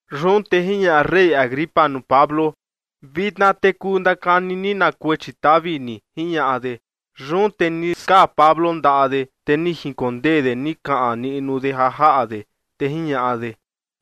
Yun te jiñaꞌa rey Agripa nuu Pablo: ―Vitna te kuu ndakani ni na kuechi tavi ni ―jiñaꞌa de. Yun te ni skaa Pablo ndaꞌa de, te ni jinkondee de ni kaꞌan niꞌnu de ja jaꞌa de, te jiñaꞌa de: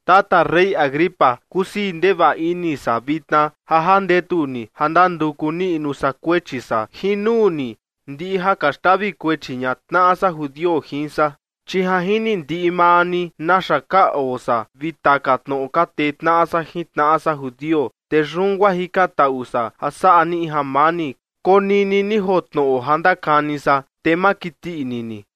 ―Tata rey Agripa, kusii ndevaꞌa ini san vitna ja jandetu ni ja ndanduku niꞌnu san kuechi san jin nuu ni, ndiꞌi ja ka xtavi kuechi ña tnaꞌa san judio jin san. Chi ja jini ndiꞌi maa ni naxa ka oo san vi taka tnoꞌo ka tee tnaꞌa san jin tnaꞌa san judio, te yun guaa jikantaꞌu san ja saꞌa ni in jamani, konini ni joo tnoꞌo ja ndakani san, te ma kiti ini ni.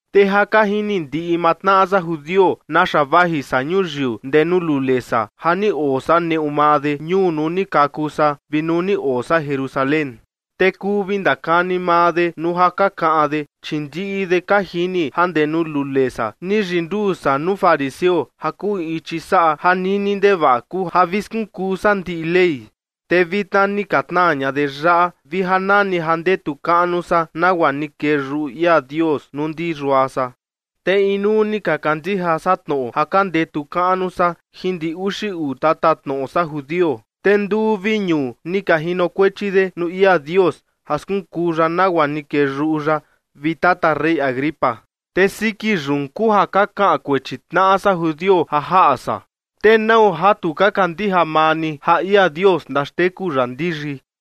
’Te ja ka jini ndiꞌi maa tnaꞌa san judio naxa vaji san ñuyiu ndee nuu lule san ja ni oo san neꞌu maa de, ñuu nuu ni kaku san vi nuu ni oo san Jerusalén. Te kuu vi ndakani maa de nuu ja ka kaꞌan de, chi ndiꞌi de ka jini ja ndee nuu lule san ni yinduu san nuu fariseo ja kuu in ichi saꞌa ja nini ndevaꞌa kuu ja vi skunkuu san ndiꞌi Ley. Te vitna ni ka tnaa ña de yaꞌa vi ja nani ja ndetu kaꞌnu san nagua ni kee yuꞌu ia Dios nuu ndi yua san. Te inuu ni ka kandija san tnoꞌo ja ka ndetu kaꞌnu san jin ndi uxi uu tatatnoꞌo san judio, te nduu vi ñuu ni ka jinokuechi de nuu ia Dios ja skunkuu ya nagua ni kee yuꞌu ya, vi tata rey Agripa. Te siki yun kuu ja ka kaꞌan kuechi tnaꞌa san judio ja jaꞌa san. ¿Te nau ja tu ka kandija maa ni ja ia Dios ndaxteku ya ndiyi?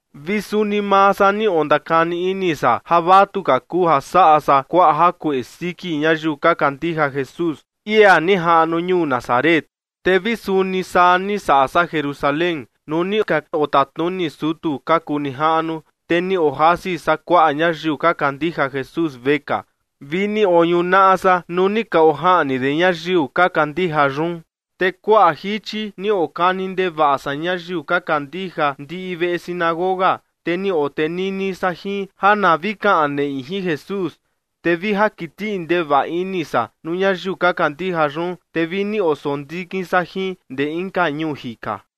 ’Vi suni maa san ni ondakani ini san ja vatuka kuu ja saꞌa san kuaꞌa jakueꞌe siki ñayiu ka kandija Jesús, ia ni jaꞌnu ñuu Nazaret. Te vi suni saa ni saꞌa san Jerusalén nuu ni ka otatnuni sutu ka kuu nijaꞌnu. Te ni ojasi san kuaꞌa ñayiu ka kandija Jesús vekaa vi ni oñunaꞌa san nuu ni ka ojaꞌni de ñayiu ka kandija yun. Te kuaꞌa jichi ni okani ndevaꞌa san ñayiu ka kandija ndiꞌi veꞌe sinagoga, te ni otenini san jin ja na vi kaꞌan neꞌi jin Jesús. Te vi ja kiti ndevaꞌa ini san nuu ñayiu ka kandija yun, te vi ni osondikin san jin ndee inka ñuu jika.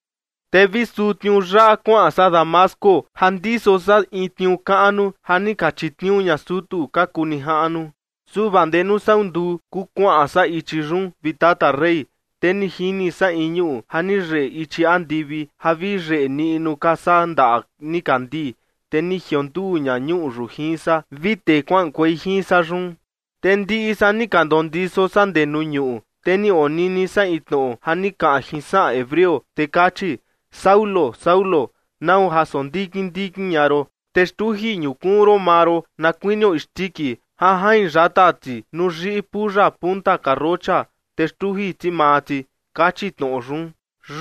’Te vi suu tniuu yaꞌa kuaꞌan san Damasco ja ndiso san in tniuu kaꞌnu ja ni ka chitniuu ña sutu ka kuu nijaꞌnu. Su vaa ndee nuu sau nduu kuu kuaꞌan san ichi yun, vi tata rey, te ni jini san in ñuꞌu ja ni yeꞌe ichi andivi ja vi yeꞌe niꞌnu ka saa ndaꞌa nikandii, te ni jionduu ña ñuꞌu yun jin san vi tee kuaꞌankuei jin san yun. Te ndiꞌi san ni ka ndondiso san ndee nuu ñuꞌu, te ni onini san in tnoꞌo ja ni kaꞌan jin saꞌan hebreo, te kachi: “Saulo, Saulo, ¿nau ja sondikin ndikin ña ron? Te xtuji ñukuun ron maa ron na kuinio isndiki ja jain yata ti nuu yiꞌi puya punta karrocha, te xtuji ti maa ti” kachi tnoꞌo yun.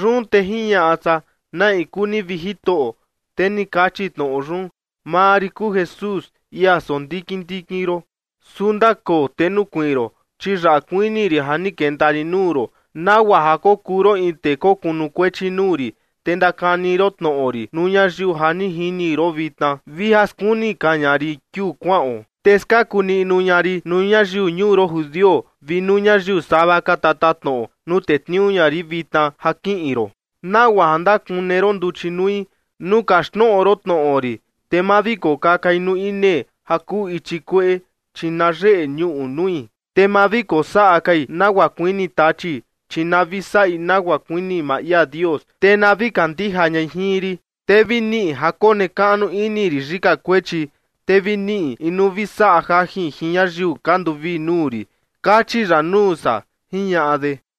Yun te jiñaꞌa san: “¿Na in kuu ni, vi Jitoꞌo?” Te ni kachi tnoꞌo yun: “Maa rin kuu Jesús, ia sondikin ndikin ron. Su ndakoo te nukuiin ron, chi yaꞌa kuini rin ja ni kenta rin nuu ron, nagua ja kokuu ron in tee kokunukuechi nuu rin, te ndakani ron tnoꞌo rin nuu ñayiu ja ni jini ron vitna vi ja skuni ka ña rin kiuu kuaꞌon. Te skaku niꞌnu ña rin nuu ñayiu ñuu ron judio vi nuu ñayiu sava ka tatatnoꞌo nuu tetniuu ña rin vitna ja kiꞌin ron, nagua ja ndakune ron nduchi nui nuu kaxtnoꞌo ron tnoꞌo rin, te ma vi kokakai nuu inee ja kuu ichi kueꞌe, chi na yeꞌe ñuꞌu nui. Te ma vi kosaꞌa kai nagua kuini Tachi, chi na vi saꞌi nagua kuini maa ia Dios, te na vi kandija ñai jin rin. Te vi niꞌi ja konekaꞌnu ini rin yika kuechi, te vi niꞌi in nuu vi saꞌa jajin jin ñayiu ka nduvii nuu rin”, kachi ya nuu san ―jiñaꞌa de.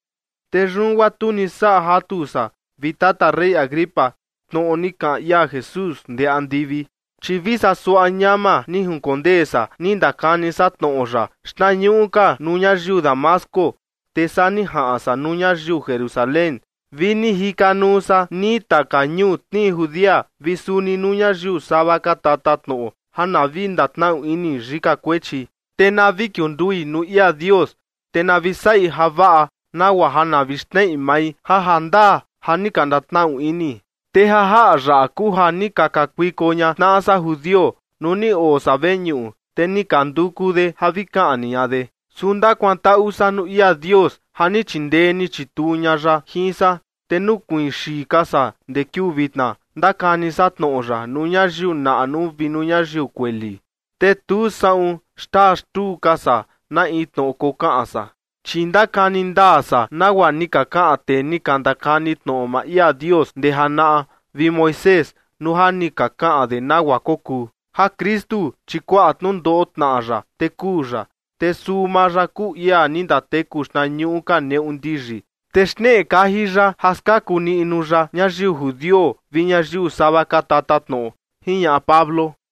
’Te yun guaa tu ni saꞌa jatu san, vi tata rey Agripa, tnoꞌo ni kaꞌan ia Jesús ndee andivi. Chi vi saa suaꞌa ñama ni jinkondee san ni ndakani san tnoꞌo ya, xtnañuꞌu ka nuu ñayiu Damasco, te saa ni jaꞌan san nuu ñayiu Jerusalén vi ni jikanuu san nii taka ñuu tnii Judea, vi suni nuu ñayiu sava ka tatatnoꞌo, ja na vi ndatnaꞌu ini yika kuechi, te na vi kiundui nuu ia Dios, te na vi saꞌi javaꞌa nagua ja na vi xneꞌi mai ja jandaa ja ni ka ndatnaꞌu ini. Te ja jaꞌa yaꞌa kuu ja ni ka kakuiko ña tnaꞌa san judio nuu ni oo san veñuꞌu, te ni ka nduku de ja vi kaꞌni ña de. Su ndakuantaꞌu san nuu ia Dios ja ni chindee ni chituu ña ya jin san, te nukuiin xii ka san ndee kiuu vitna, ndakani san tnoꞌo ya nuu ñayiu naꞌnu vi nuu ñayiu kueli. Te tu saꞌun xtaa xtuu ka san na in tnoꞌo kokaꞌan san, chi ndakani ndaa san nagua ni ka kaꞌan tee ni ka ndakani tnoꞌo maa ia Dios ndee janaꞌa vi Moisés nuu ja ni ka kaꞌan de nagua kokuu: Ja Kristu, chi kuaꞌa tnundoꞌo tnaꞌa ya, te kuu ya. Te suu maa ya kuu ia ni ndateku xtnañuꞌu ka neꞌu ndiyi, te xneꞌe kaji ya ja skaku niꞌnu ya ñayiu judio vi ñayiu sava ka tatatnoꞌo ―jiñaꞌa Pablo.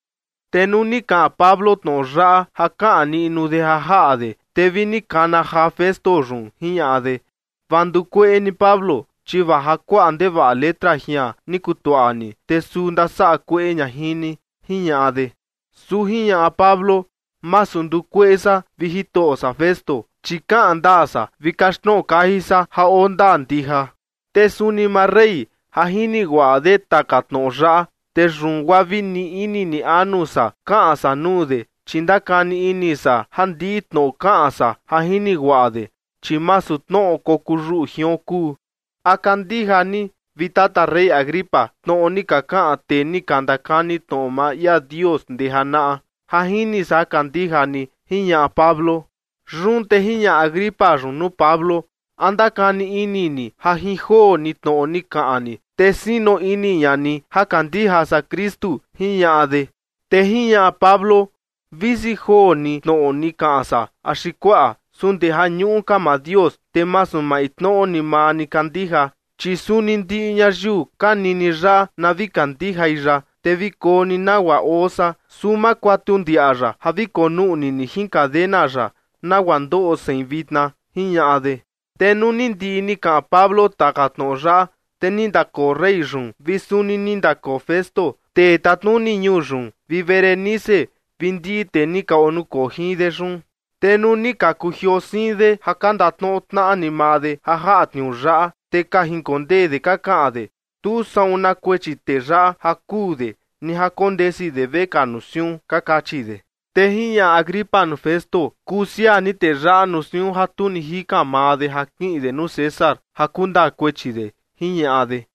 Te nuu ni kaꞌan Pablo tnoꞌo yaꞌa ja kaꞌan niꞌnu de ja jaꞌa de, te vi ni kana jaa Festo yun, jiñaꞌa de: ―Vaa ndukueꞌe ni Pablo, chi vaa ja kuaꞌa ndevaꞌa letra jian ni kutuaꞌa ni, te suu ndasaꞌa kueꞌe ña jin ni ―jiñaꞌa de. Su jiñaꞌa Pablo: ―Masu ndukueꞌe san, vi jitoꞌo san Festo, chi kaꞌan ndaa san vi kaxtnoꞌo kaji san ja oo ndaa ndija. Te suni maa rey, ja jini guaꞌa de taka tnoꞌo yaꞌa, te yun guaa vi ni ini ni anu san kaꞌan san nuu de, chi ndakani ini san ja ndiꞌi tnoꞌo kaꞌan san ja jini guaꞌa de, chi masu tnoꞌo kokuu yuꞌu jion kuu. ¿A kandija ni, vi tata rey Agripa, tnoꞌo ni ka kaꞌan tee ni ka ndakani tnoꞌo maa ia Dios ndee janaꞌa? Ja jini san ja kandija ni ―jiñaꞌa Pablo. Yun te jiñaꞌa Agripa yun nuu Pablo: ―¿A ndakani ini ni ja jin joo ni tnoꞌo ni kaꞌan ni, te sino ini ña ni ja kandija san Kristu? ―jiñaꞌa de. Te jiñaꞌa Pablo: ―Visi joo ni tnoꞌo ni kaꞌan san axi kuaꞌa, su ndeja ñuꞌu ka maa Dios. Te masu maintnoꞌo ni maa ni kandija, chi suni ndiꞌi ñayiu ka nini yaꞌa na vi kandijai ya, te vi koo ni nagua oo san, su ma kuatu ndiaꞌa ya ja vi konuꞌni ni jin cadena yaꞌa, nagua ndoꞌo sein vitna ―jiñaꞌa de. Te nuu ni ndiꞌi ni kaꞌan Pablo taka tnoꞌo yaꞌa, te ni ndakoo rey yun vi suni ni ndakoo Festo, tee tatnuni ñuu yun, vi Berenice vi ndiꞌi tee ni ka onukoo jin de yun. Te nuu ni ka kujioo siin de ja ka ndatnoꞌo tnaꞌa ni maa de ja jaꞌa tniuu yaꞌa, te ka jinkondee de ka kaꞌan de: ―Tu saꞌun na kuechi tee yaꞌa ja kuu de, ni ja kondesi de vekaa nuu siun ―ka kachi de. Te jiñaꞌa Agripa nuu Festo: ―Kuu siaa ni tee yaꞌa nuu siun ja tu ni jikan maa de ja kiꞌin de nuu César ja kundaa kuechi de ―jiñaꞌa de.